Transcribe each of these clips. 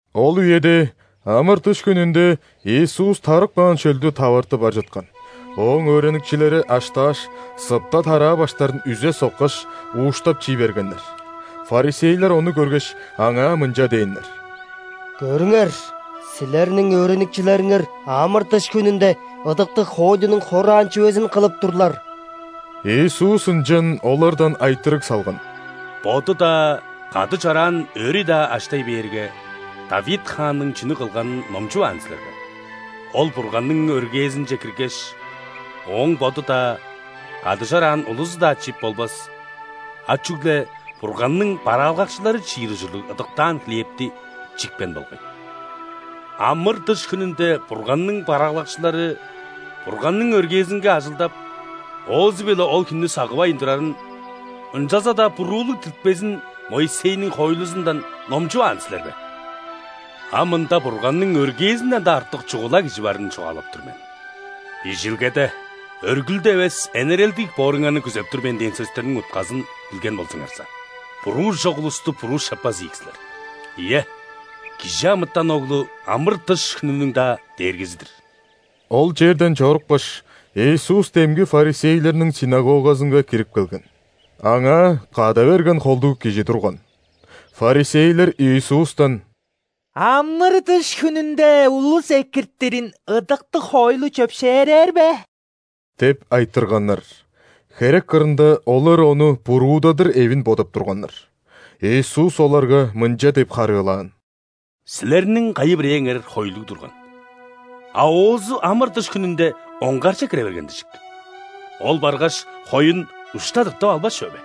Ол үеде, ·амыр-дыш хүнүнде, Иисус тарып каан шөлдү таварты бар чыткан. Ооң өөреникчилери аштааш, сыпта тараа баштарын үзе соккаш, ууштап чий бергеннер. ·Фарисейлер ону көргеш, Аңаа мынча дээннер: «Көрүңер! Силерниң өөреникчилериңер амыр-дыш хүнүнде ыдыктыг хоойлунуң хораан чүвезин кылып турлар». Иисус ынчан олардан айтырыг салган: «Боду-даа, кады чораан өөрү-даа аштай бээрге, Давид хаанның чүнү кылганын номчуваан силер бе? Ол Бурганның өргээзинче киргеш, ооң боду-даа, кады чораан улузу-даа чип болбас, а чүгле Бурганның бараалгакчылары чиир ужурлуг ыдыктаан хлебти чипкен болгай. Амыр-дыш хүнүнде Бурганның бараалгакчылары Бурганның өргээзинге ажылдап, оозу-биле ол хүннү сагывайн турарын, ынчалза-даа буруулуг диртпезин Моисейниң хоойлузундан номчуваан силер бе? А мында Бурганның өргээзинден-даа артык чугула Кижи барын чугаалап тур мен. Бижилгеде: „Өргүлдү эвес, энерелдиг бооруңарны күзеп тур мен“ – дээн сөстерниң утказын билген болзуңарза, буруу чок улусту буруу шаппас ийик силер. Ийе, ·Кижи амытан Оглу – ·амыр-дыш хүнүнүң-даа Дээргизи-дир!» Ол черден чорупкаш, Иисус демги ·фарисейлерниң ·синагогазынга кирип келген. Аңаа када берген холдуг кижи турган. Фарисейлер Иисустан: «Амыр-дыш хүнүнде улус экиртирин ыдыктыг хоойлу чөпшээрээр бе?» – деп айтырганнар. (Херек кырында олар Ону буруудадыр эвин бодап турганнар.) Иисус оларга мынча деп харыылаан: «Силерниң кайы-бирээңер хойлуг турган, а оозу ·амыр-дыш хүнүнде оңгарже кире берген дижик. Ол баргаш, хоюн ушта тыртып албас чүве бе?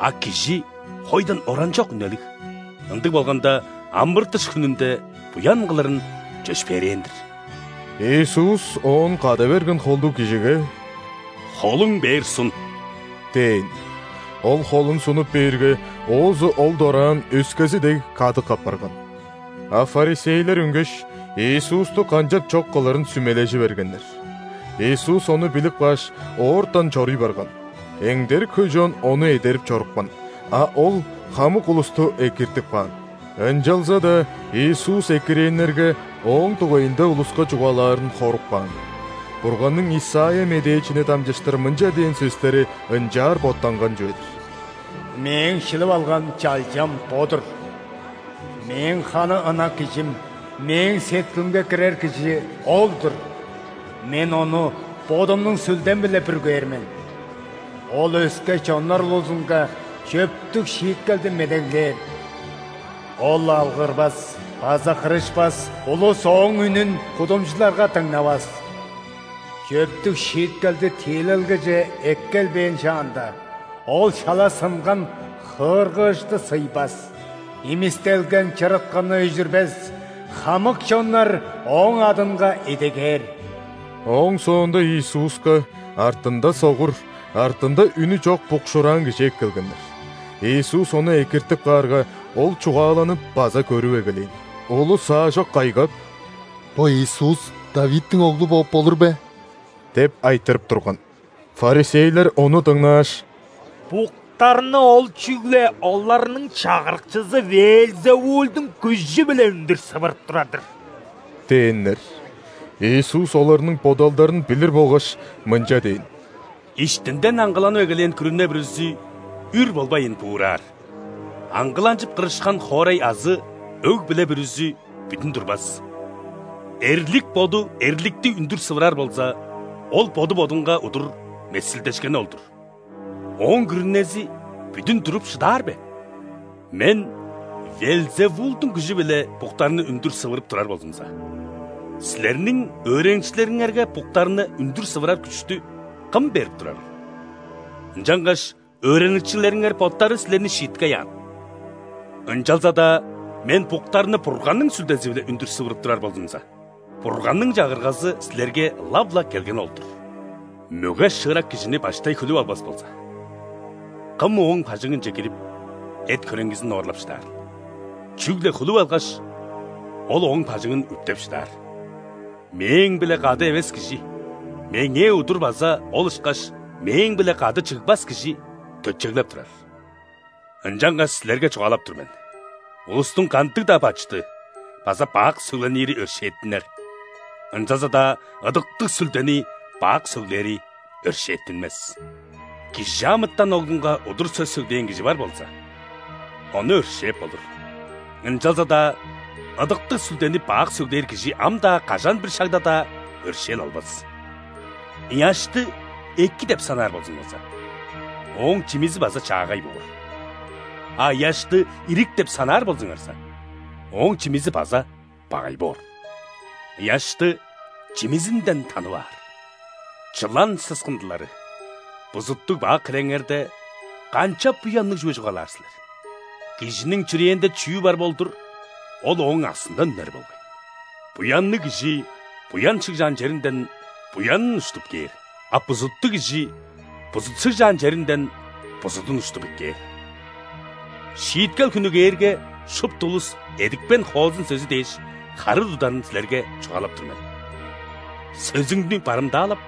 А кижи хойдан оранчок үнелиг! Ындыг болганда, амыр-дыш хүнүнде буян кылырын чөпшээрээн-дир». Иисус оон када берген холдуг кижиге: «Холуң бээр сун» – дээн. Ол холун сунуп бээрге, оозу ол дораан, өскези дег, кадык апарган. А ·фарисейлер үнгеш, Иисусту канчап чок кылырын сүмележи бергеннер. Иисус ону билип кааш, оортан чоруй барган. Эңдерик хөй чон Ону эдерип чорупкан, а Ол хамык улусту экиртип каан. Ынчалза-даа Иисус экирээннерге Ооң дугайында улуска чугаалаарын хоруп каан. Бурганның Исайя медээчини дамчыштыр мынча дээн сөстери ынчаар боттанган чүве-дир: «Мээң шилип алган Чалчам бо-дур.Мээң ханы ынак Кижим, Мээң сеткилимге кирер Кижи – Ол-дур.Мен Ону Бодумнуң Сүлдем-биле бүргээр мен.Ол өске чоннар улузунга чөптүг шииткелди медеглээр! Ол алгырбас база кырышпас,улус Ооң үнүн кудумчуларга дыңнавас. Чөптүг шииткелди тиилелгеже эккелбээн шаанда,Ол шала сынган хыыргыышты сыйбас,имистелген чырыткыны өжүрбес. Хамык чоннар Ооң адынга идегээр». Ооң соонда Иисуска артында согур, артында үнү чок букшуураан кижи эккелгеннер. Иисус ону экиртип каарга, ол чугааланып база көрүп эгелээн. Улус аажок кайгап: «Бо Иисус ·Давидтиң Оглу бооп болур бе?» – деп айтырып турган. ·Фарисейлер ону дыңнааш: «Буктарны Ол чүгле оларның чагырыкчызы ·Веелзевулдуң күжү-биле үндүр сывырып турар-дыр» – дээннер. Иисус оларның бодалдарын билир болгаш, мынча дээн: «Иштинден аңгыланып эгелээн күрүне бүрүзү үр болбайн буураар, аңгыланчып, кырышкан хоорай азы өг-бүле бүрүзү бүдүн турбас. Эрлик боду эрликти үндүр сывырар болза, ол боду бодунга удур месилдешкени ол-дур. Ооң күрүнези бүдүн туруп шыдаар бе? Мен ·Веелзевулдуң күжү-биле буктарны үндүр сывырып турар болзумза, силерниң өөреникчилериңерге буктарны үндүр сывырар күштү кым берип турарыл? Ынчангаш өөреникчилериңер боттары силерни шииткей аан. Ынчалза-даа Мен буктарны Бурганның Сүлдези-биле үндүр сывырып турар болзумза, Бурганның Чагыргазы силерге ылап-ла келгени ол-дур. Мөге-шыырак кижини баштай хүлүп албас болза, кым ооң бажыңынче кирип, эт-хөреңгизин оорлап шыдаарыл? Чүгле хүлүп алгаш, ол ооң бажыңын үптеп шыдаар. Мээң-биле кады эвес кижи Меңээ удур база ол ышкаш Мээң-биле кады чыгбас кижи төтчеглеп турар. Ынчангаш силерге чугаалап тур мен: улустуң кандыг-даа бачыды база бак сөгленири өршээттинер, ынчалза-даа Ыдыктыг Сүлдени бак сөглээри өршээттинмес. ·Кижи амытан Оглунга удур сөс сөглээн кижи бар болза, ону өршээп болур, ынчалза-даа Ыдыктыг Сүлдени бак сөглээр кижи ам-даа, кажан-бир шагда-даа өршээл албас. Ыяшты эки деп санаар болзуңарза, ооң чимизи база чаагай боор, а ыяшты ирик деп санаар болзуңарза, ооң чимизи база багай боор. Ыяшты чимизинден танып аар. Чылан сыскындылары! Бузуттуг-бак хиреңерде, канчап буянныг чүве чугаалаар силер? Кижиниң чүрээнде чүү бар болдур, ол ооң аксындан үнер болгай. Буянныг кижи буян шыгжаан черинден буянын уштуп кээр, а бузуттуг кижи бузут шыгжаан черинден бузудун уштуп эккээр. Шииткел хүнү кээрге, шупту улус эдипкен хоозун сөзү дээш харыы тударын силерге чугаалап тур мен. Сөзүңнү барымдаалап,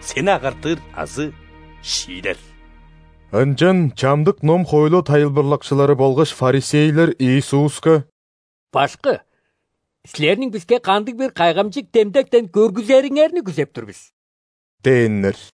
сени агартыр азы шиидер». Ынчан чамдык ном-хоойлу тайылбырлакчылары болгаш ·фарисейлер Иисуска: «Башкы, Силерниң биске кандыг-бир кайгамчык демдектен көргүзериңерни күзеп тур бис» – дээннер.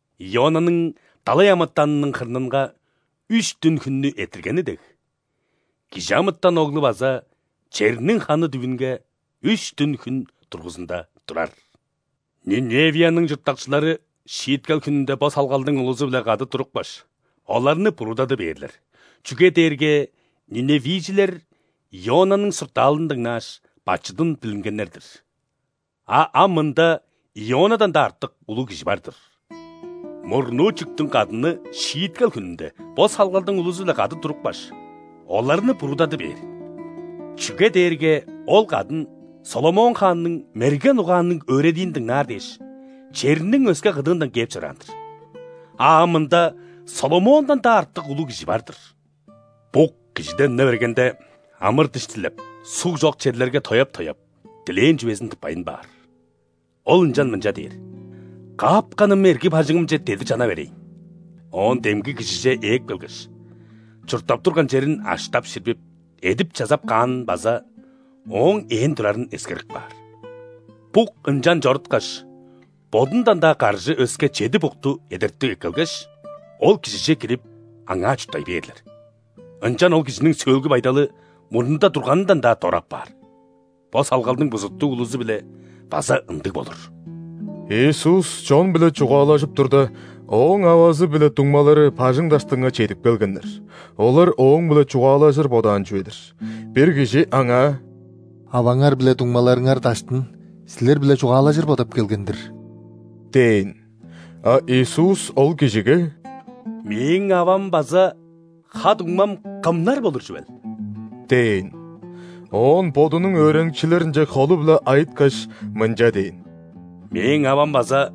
Ионаның далай амытанының хырнынга үш дүн-хүннү эрттиргени дег, ·Кижи амытан Оглу база черниң ханы дүвүнге үш дүн-хүн дургузунда турар. Ниневияның чурттакчылары шииткел хүнүнде бо салгалдың улузу-биле кады турупкаш, оларны буруудады бээрлер, чүге дээрге ниневийжилер Ионаның суртаалын дыңнааш, бачыдын билингеннер-дир. А ам мында Ионадан-даа артык улуг Кижи бар-дыр! Мурнуу чүктүң кадыны Шииткел хүнүнде бо салгалдың улузу-биле кады турупкаш, оларны буруудады бээр, чүге дээрге ол кадын ·Соломон хаанның мерген угаанныг өөредиин дыңнаар дээш, черниң өске кыдыындан кээп чораан-дыр. А ам мында Соломондан-даа артык улуг Кижи бар-дыр!» «Бук кижиден үне бергенде, амыр-дыш дилеп, суг чок черлерге тояап-тояап, дилээн чүвезин тыппайн баар. Ол ынчан мынча дээр: „Каапканым эрги бажыңымче дедир чана берейн“. Оон демги кижиже ээп келгеш, чурттап турган черин аштап-ширбип, эдип-чазап каанын база ооң ээн турарын эскерип каар. Бук ынчан чоруткаш, бодундан-даа каржы өске чеди букту эдертип эккелгеш, ол кижиже кирип, аңаа чурттай бээрлер. Ынчан ол кижиниң сөөлгү байдалы мурнунда турганындан-даа дора апаар. Бо салгалдың бузуттуг улузу-биле база ындыг болур». Иисус чон-биле чугаалажып турда, Ооң авазы биле дуңмалары бажың даштынга чедип келгеннер: олар Ооң-биле чугаалажыр бодаан чүве-дир. Бир кижи Аңаа: «Аваңар биле дуңмаларыңар даштын Силер-биле чугаалажыр бодап келген-дир» – дээн. А Иисус ол кижиге: «Мээң авам база ха-дуңмам кымнар болур чүвел?» – дээн. Оон Бодунуң өөреникчилеринче холу-биле айыткаш, мынча дээн: «Мээң авам база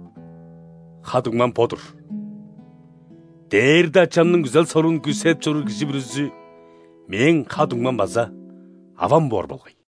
ха-дуңмам бо-дур. Дээрде Ачамның күзел-соруун күүседип чоруур кижи бүрүзү Мээң ха-дуңмам база авам боор болгай».